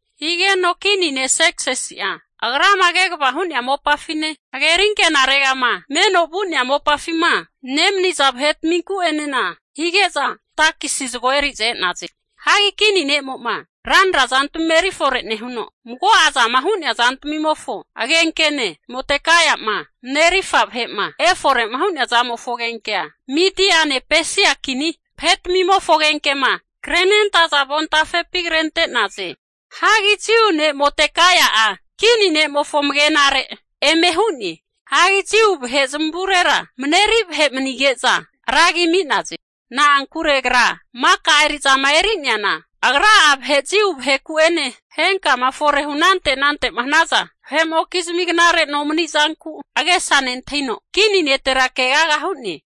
Higeno kini ne' Serksisi'a agrama kegavama hu'nea mopafine, hageri ankenaregama meno vu'nea mopafima nemaniza vahetminku'enena hige'za, takisi zagoa eri'za e'naze. Hagi kini ne'mo'ma ranana zantmima erifore nehuno, mago'a zama hu'nea zantmimofo agenkene Modekaia'ma marerirfa vahe'ma efore'ma hu'nea zamofo agenkea Mediane Pesia kini vahetmimofo agenkema krenentaza avontafepi krente'naze. Hagi Jiu ne' Modekaia'a kini ne'mofo amagenare eme hu'ne. Hagi Jiu vahe zamavurera mareri vahe manige'za ra agi ami'naze. Na'ankure agra maka eri'zama eri'neana, agra'a vahe Jiu vaheku'ene henkama fore'ma hunante anante'ma hanaza vahe'mokizmi knare nomanizanku agesa nentahino, kini netera keaga hu'ne.